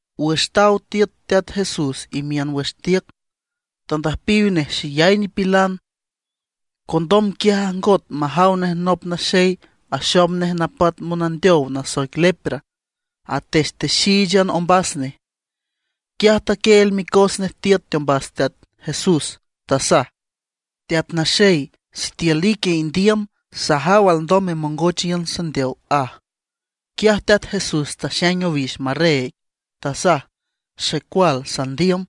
Wüx taw tiüt Teat Jesús imiün wüx tiüc, tandüjpiw nej xeyay nipilan. Condom quiaj ajngot majaw nej nop naxey axom nej napat monandeow nasoic lepra atextexíichan ombas nej. Quiaj taquieel micos nej tiüt teombas Teat Jesús, tasaj: ―Teat Naxey, sitiül ique indiüm, sajaw alndom memongoch iün sandeow ―aj. Quiaj Teat Jesús taxaing owix marreeg, tasaj: ―Xecual sandiüm,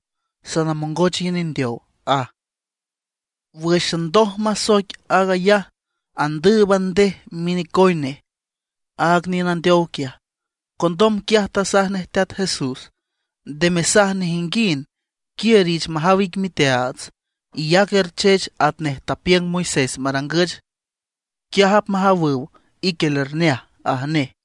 sanamongoch iün indeow ―aj. Wǘxan ndoj masoic aag ayaj, andǘüban ndej minecoy nej aaga niün andeow quiaj. Condom quiaj tasaj nej Teat Jesús: ―Nde mesaj nejinguind, quiür, iich majaw ic miteaats, iyac erchech atnej tapiüng Moisés marangüch. Quiaj apmajawüw ique lerneaj ―aj nej.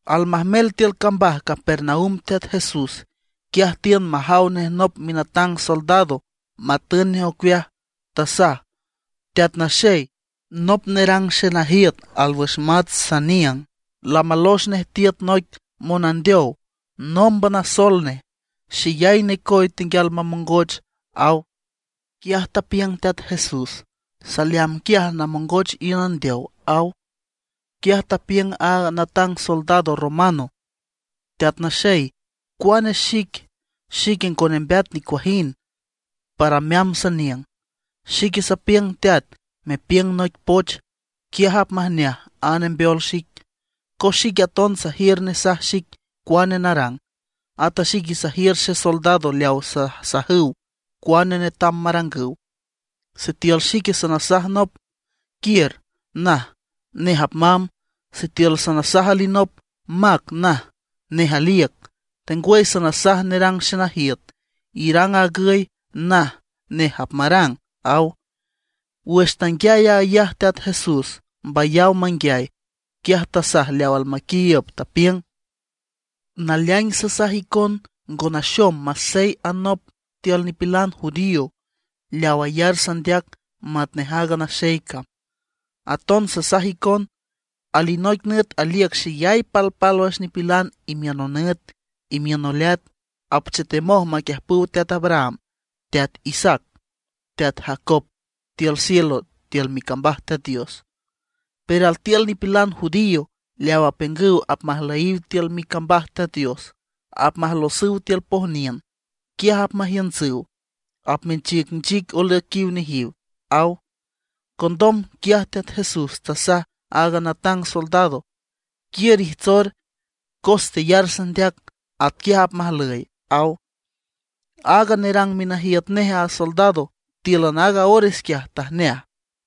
Almajmel tiül cambaj Capernaum Teat Jesús, quiaj tiün majaw nej nop minatang soldado matün nej ocueaj. Tasaj: ―Teat Naxey, nop nerang xenajiüt alwüx mats saniüng, lamalox nej tiüt noic monandeow. Nómban asol nej, xeyay necoy tenguial mamongoch ―aw. Quiaj tapiüng Teat Jesús: ―Saleamb quiaj namongoch iün andeow ―aw. Quiaj tapiüng a natang soldado romano: ―Teat Naxey, cuane xic, xique ngo nembeat nicuajind para meamb saniüng. Xique sapiüng teat, mepiüng noic poch, quiaj apmajneaj a nembeol xic. Cos xique aton sajiür nesaj xic cuane narang, at a xique sajiür xesoldado leaw sasajüw cuane netam marangüw. Sitiül xique sanasaj nop: “Quiür”, naj; nej apmamb. Sitiül sanasaj alinop: “Mac”, naj; nej aliüc. Tengwüy sanasaj nerang xenajiüt: “Irang aag agüy”, naj; nej apmarang ―aw. Wüx tanguiay aag ayaj Teat Jesús mbayaw manguiay, quiaj tasaj leaw almaquiiüb, tapiüng: ―Naleaing sasaj icon ngo naxom masey anop tiül nipilan judío leaw ayar sandeac matnej aaga naxey cam. Aton sasaj icon, alinoic nüt aliüc xeyay palpálwüx nipilan imiün nonüt, imiün noleat, apchetemoj maquiüjpüw teat Abraham, teat Isaac, teat Jacob tiül cielo tiül micambaj Teat Dios. Pero altiül nipilan judío leaw apiüngüw apmajlüyiw tiül micambaj Teat Dios, apmajlosüw tiül pojniün, quiaj apmajiüntsüw, apmenchicnchic olüiquiw nejiw ―aw. Condom quiaj Teat Jesús tasaj aaga natang soldado: ―Quiür ijtsor, cos teyar sandeac atquiaj apmajlüy ―aw. Aaga nerang minajiüt nej a soldado tíülan aaga ores quiaj tajneaj.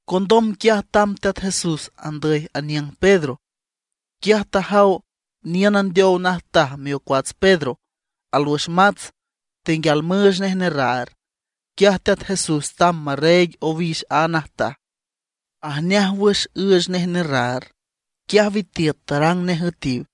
Condom quiaj tamb Teat Jesús andüy aniüng Pedro. Quiaj tajaw niün andeow najtaj miocuats Pedro, alwüx mats, tenguial müüch nej nerraar. Quiaj Teat Jesús tamb marreeg owix aaga najtaj, ajneaj wüx üüch nej nerraar. Quiaj witiüt tarang nej üetiw.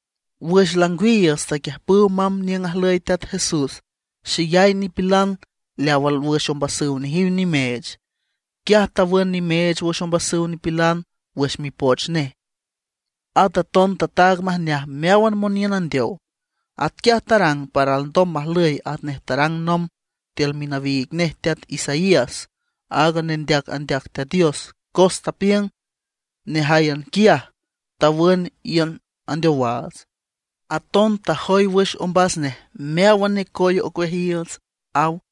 Wüx langwiiüts taquiüjpüw mamb niüng ajlüy Teat Jesús xeyay nipilan leaw alwüx ombasüw nejiw nimeech. Quiaj tawün nimeech wüx ombasüw nipilan wüx mipoch nej, at aton tataag majneaj meáwan moniün andeow. Atquiaj tarang para alndom majlüy atnej tarang nomb tiül minawiig nej teat Isaías, aaga nendeac andeac Teat Dios, cos tapiüng: “Nejáyan quiaj tawün iün andeowaats, aton tajoy wüx ombas nej meáwan necoy ocueajiiüts”, aw.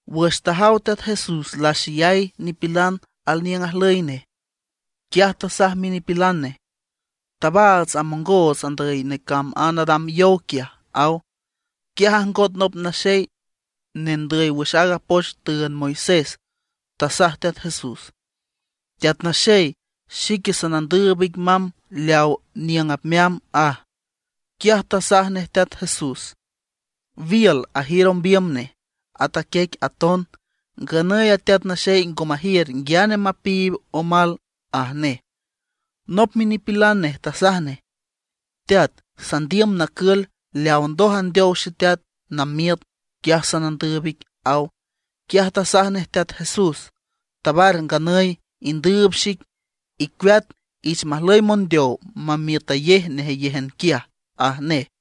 Wüx tajaw Teat Jesús laxeyay nipilan alniüng ajlüy nej, quiaj tasaj minipilan nej: ―Tabaats amongoots andüy necamb a nadam yow quiaj ―aw. Quiaj ajngot nop naxey nendüy wüx aaga poch tüünd Moisés. Tasaj Teat Jesús: ―Teat Naxey, xique sanandüüb ic mamb leaw niüng apmeamb ―aj. Quiaj tasaj nej Teat Jesús: ―Wiül ajiür ombiüm nej, at a quiec aton; nganüy a Teat Naxey ngo majiür nguiane mapiib omal ―aj nej. Nop minipilan nej tasaj nej: ―Teat, sandiüm nacül leaw ndoj andeow xeteat namiüt; quiaj sanandüüb ic ―aw. Quiaj tasaj nej Teat Jesús: ―Tabar nganüy indüüb xic, icueat, ich majlüy mondeow memiütayej nejeyéjan quiaj ―aj nej.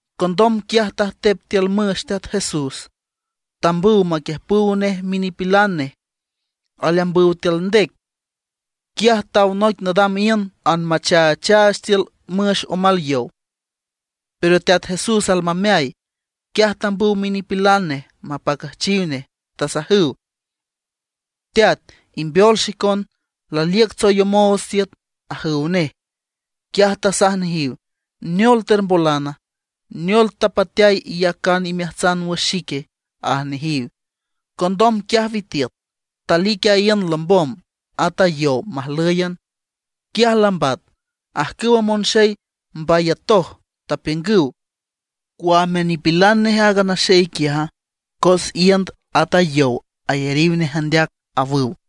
Condom quiaj tajtep tiül müx Teat Jesús, tambüw maquiüjpüw nej minipilan nej. Aleambüw tiül ndec, quiaj taw noic nadam iünd, anmachaachaach tiül müx omal yow, pero Teat Jesús almameay. Quiaj tambüw minipilan nej mapacüjchiw nej, tasajüw: ―¡Teat, imbeol xicon; laliüc tsoyomoots tiüt! ―ajüw nej. Quiaj tasaj nejiw: ―¿Neol termbolana? ¿Neol tapateay iyacan imeajtsan wüx xique? ―aj nejiw. Condom quiaj witiüt. Talic a iünd lombom, at a yow majlǘyan. Quiaj lambat. Ajcüwa monxey mbayatoj, tapiüngüw: ―¿Cuame nipilan nej aaga naxey quiaja? Cos iünd at a yow ayariw nej andeac ―awüw.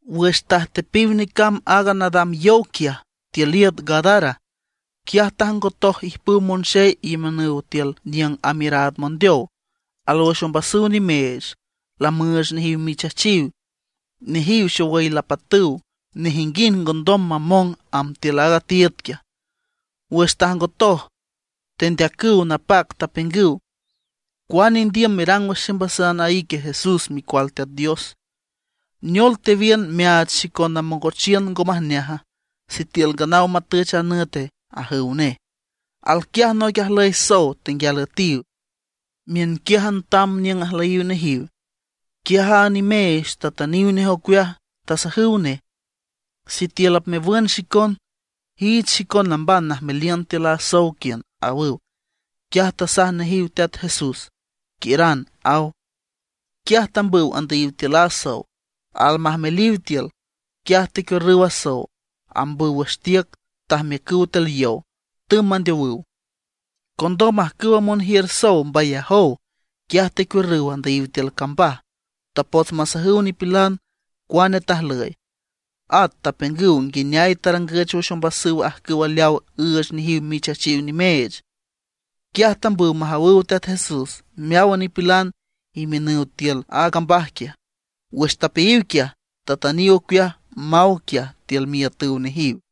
Wüx tajtepiw necamb aaga nadam yow quiaj tiül iüt Gadara, quiaj tajngotoj ijpüw monxey imiünüw tiül niüng amiüraad mondeow. Alwüx ombasüw nimeech, lamüüch nejiw michachiw. Nejiw xowüy lapatüw, nejinguind ngondom mamong amb tiül aaga tiiüd quiaj. Wüx tajngotoj, tendeacüw napac, tapiüngüw: ―¿Cuane indiüm merang wüx ximbasan a ique Jesús micual Teat Dios? ¿Neol tewiün meaach xicon namongochiün ngo majneaja, sitiül nganaw matüch a nüte? ―ajüw nej. Alquiaj noic ajlüy sow tenguial üetiw, miünquiájan tam niüng ajlüyiw nejiw. Quiaj a nimeech tatüniw nej ocueaj, tasajüw nej: ―Sitiül apmewün xicon, iich xicon namban najmeliün tiül a sow quiün ―awüw. Quiaj tasaj nejiw Teat Jesús: ―Quiüran ―aw. Quiaj tambüw tandüyiw tiül a sow. Almajmeliw tiül, quiaj tecuiürrüw a sow, ambüw wüx tiüc tajmiücüw tiül yow, tümb mandeowüw. Condom ajcüwa monjiür sow mbayajow; quiaj tecuiürrüw andüyiw tiül cambaj. Tapots masajüw nipilan cuane tajlüy; at tapiüngüw nguineay tarangüch wüx ombasüw ajcüw leawa üüch nejiw michachiw nimeech. Quiaj tambüw majawüw Teat Jesús meáwan nipilan imiünüw tiül a cambaj quiaj. Wüx tapeayiw quiaj, tatüniw ocueaj maw quiaj tiül miiütüw nejiw.